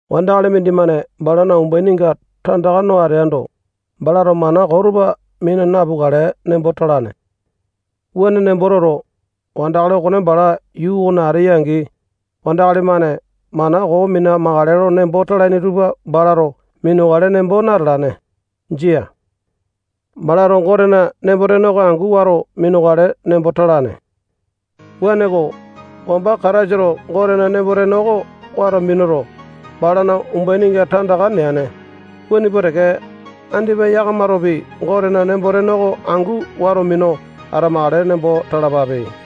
Wandakali mindimane balana umbaininga tandaka no ateando, balato mana koo tupa mina napukale nembo talane. Wuane nembo toto, wandakali okone bala yuu okona ateya-angi, wandakali-mane mana koo mina-makale nembo talaini tupa balato minukale nembo natalane. Jia. Balato Gotena nembo-tene oko angu wato minukale nembo talane. Wuaneko, wamba Kataisato Gotena nembo-tene oko wato minuto, balana umbaininga tandaka neane, wuane pua teke, andipa yakamatopi Gotena nembo-tene oko angu wato minu atamakale nembo talapape.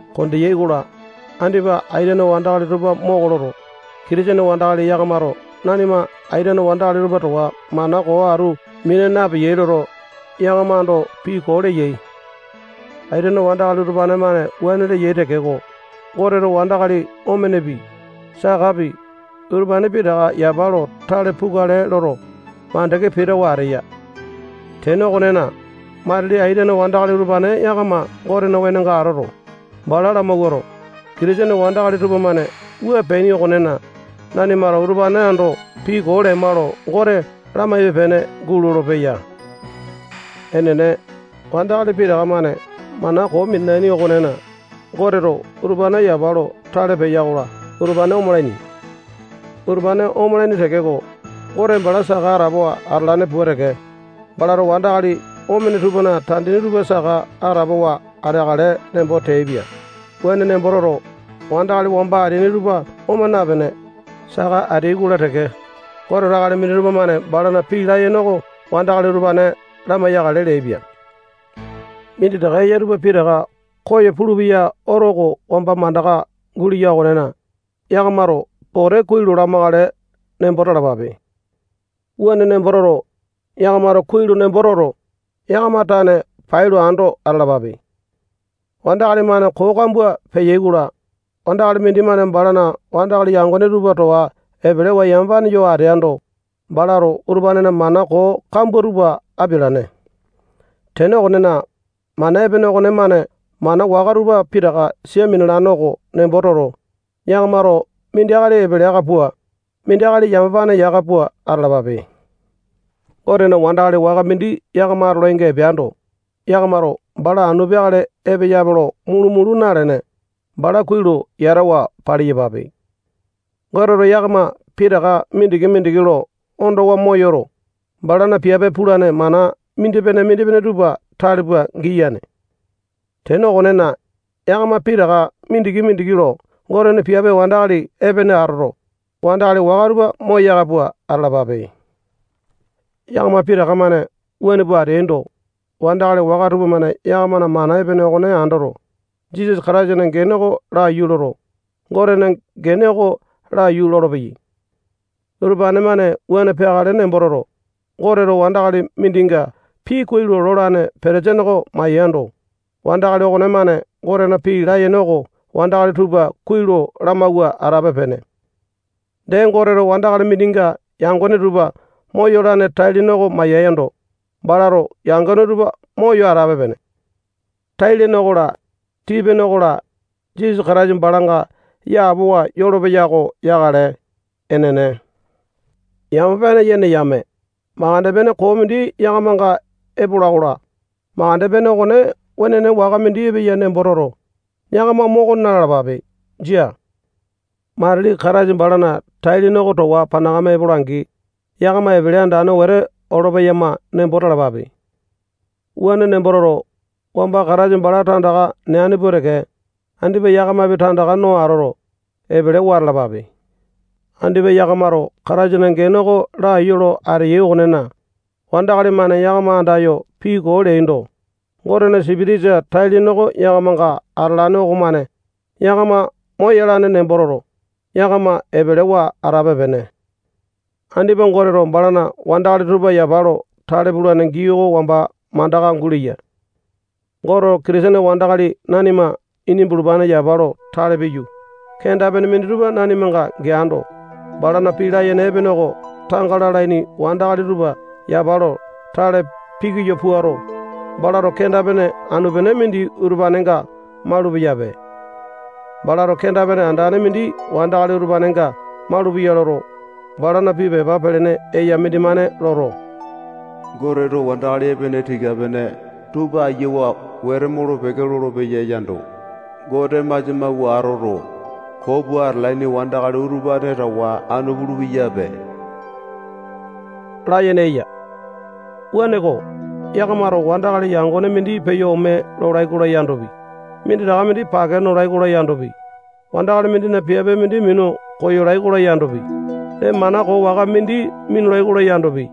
Kondeyai-kola, andipa aitene wandakali tupa moko loto, Kitisene wandakali yakamato nanima aitene wandakali tupa towa mana koo atu mina napeyai loto, yakama ando pii koo leyai. Aitene wandakali utupane-mane wuane leyai tekeko, Goteto wandakali omenepi, sakapi, utupane pitaka yapa lo tale pukale loto, mandeke pitawa ateya. Tene okonena, matili aitene wandakali utupane yakama Gotena wenonga atoto, bala lamawuato, Kitisene wandakali tupamane wua peaini okonena, nanimato utupane ando pii koo lema lo Gote lamaipe-pene gulolo-peya. Enene, wandakali pitaka-mane mana koo minalaini okonena, Goteto utupane yapa lo tale peya-kola, utupane omalaini. Utupane omalaini tekeko, Gote bala saka atapowa atalane pua teke, balato wandakali omene tupana tandini tupa saka atapowa ateakale nembo teaipia. Wuane nembo toto, wandakali wamba ateaini tupa oma napene, saka ateai-kola teke, Goteto akali minditupa-mane balana pii layene oko wandakali utupane lamai-yakale leaipia. Minditaka eya tupa pitaka koyo pulupeya oto oko wamba mandaka guleya okonena, yakamato pote kuai lo lamakale nembo talapape. Wuane nembo toto, yakamato kuai lo nembo toto, yakama tane pailo ando atalapape. Wandakali-mane koo kambua peyai-kola, wandakali mindimane balana wandakali yangone tupa towa epelewa yamapane yo ateando, balato utupanena mana koo kambua tupa apialane. Tene okonena, mana epene okonemane mana waka tupa pitaka sia minalane oko nembo toto, yakamato mindi akali epele aka pua, mindi akali yamapane yaka pua atalapape. Gotena wandakali waka mindi yakama atolainga epeando, yakamato bala anu peakale epeyape lo mulu-mulu nalene, bala kuai lo yatawa paliyapape. Goteto yakama pitaka mindiki-mindiki lo ondowa moyoto, balana piape pulane mana mindipene-mindipene tupa tale pua giyane. Tene okonena, yakama pitaka mindiki-mindiki lo Gotena piape wandakali epene atoto, wandakali waka tupa moyaka pua atalapape. Yakama pitaka-mane wuane pua ateaindo, wandakali waka tupamane yakamana mana epene okone andoto, Jisasa Kataisana gene oko laiyu loto, Gotena gene oko laiyu lolopeyai. Utupane-mane wuane peakale nembo toto, Goteto wandakali mindinga pii kuai lo lolane petesini oko maiyando, wandakali okonemane Gotena pii layene oko wandakali tupa kuai lo lamawua atape-pene. Dee, Goteto wandakali mindinga yangone tupa moyolane tai-lene oko maiyando, balato yangone tupa moyo atape-pene. Tai-lene okola, tii-pene okola, Jisasa Kataisa balanga yapowa yolopeya oko yakale. Enene. Yamapane yene yame, makande pene koo mindi yakamanga epola-kola, makande pene okone wenene waka mindi epeya nembo toto, yakama moko na-lalapape. Jia. Matili Kataisa balana tai-lene oko towa panakame epola-angi, yakama epele andane wete olo-peyama nembo talapape. Wuane nembo toto, wamba Kataisa bala tandaka neane pua teke, andipa yakamapi tandaka no atoto, epelewa atalapape. Andipa yakamato Kataisana gene oko laiyu lo ateyai okonena, wandakali-mane yakama andayo pii koo leaindo, Gotena Sipitisa tai-lene oko yakamanga atalane okomane yakama moyalane nembo toto, yakama epelewa atape-pene. Andipa Goteto balana wandakali tupa yapa lo tale pulane gii oko wamba mandaka guleya. Goteto Kitisene wandakali nanima ini bulupane yapa lo tale piyu, kenda-pene minditupa nanimanga geando, balana pii layene epene oko tanga lalaini wandakali tupa yapa lo tale pikoyo puato, balato kenda-pene anu-pene mindi utupanenga malupeyape. Balato kenda-pene andane mindi wandakali utupanenga malupeya loto, balana pii pepa pelene eya mindimane loto, Goteto wandakali epene tika-pene tupa ayiawa wete molo-peke lolopeya yando, Gote masia mawua atoto, koo pua atalaini wandakali utupane towa anu pulu-peyape layene eya. Wuaneko, yakamato wandakali yangone mindi peyo ome lolai-kola yandopi, minditaka mindi pake nolai-kola yandopi, wandakali mindina piape mindi minu koyolai-kola yandopi, dee mana koo waka mindi minulai-kola yandopi,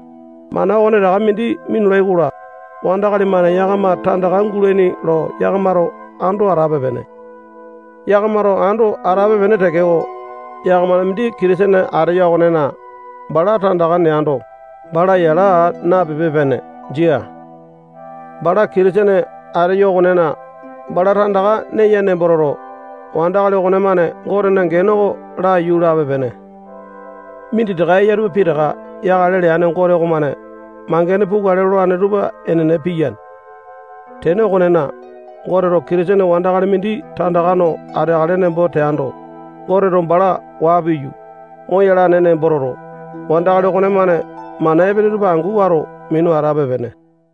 mana okonetaka mindi minulai-kola, wandakali-mane yakama tandaka gulaini lo yakamato ando atape-pene. Yakamato ando atape-pene tekeko, yakamana mindi Kitisene ateya okonena, bala tandaka neando, bala yala aa napepe-pene. Jia. Bala Kitisene ateya okonena, bala tandaka neya nembo toto, wandakali okonemane Gotena gene oko laiyu lape-pene. Minditaka eya tupa pitaka yakale leane Gote okomane mangene pukale lolane tupa enene piyane. Tene okonena, Goteto Kitisene wandakali mindi tandaka no ateakale nembo teando, Goteto bala waa piyu, moyalane nembo toto, wandakali okonemane mana epene tupa angu wato minu atape-pene.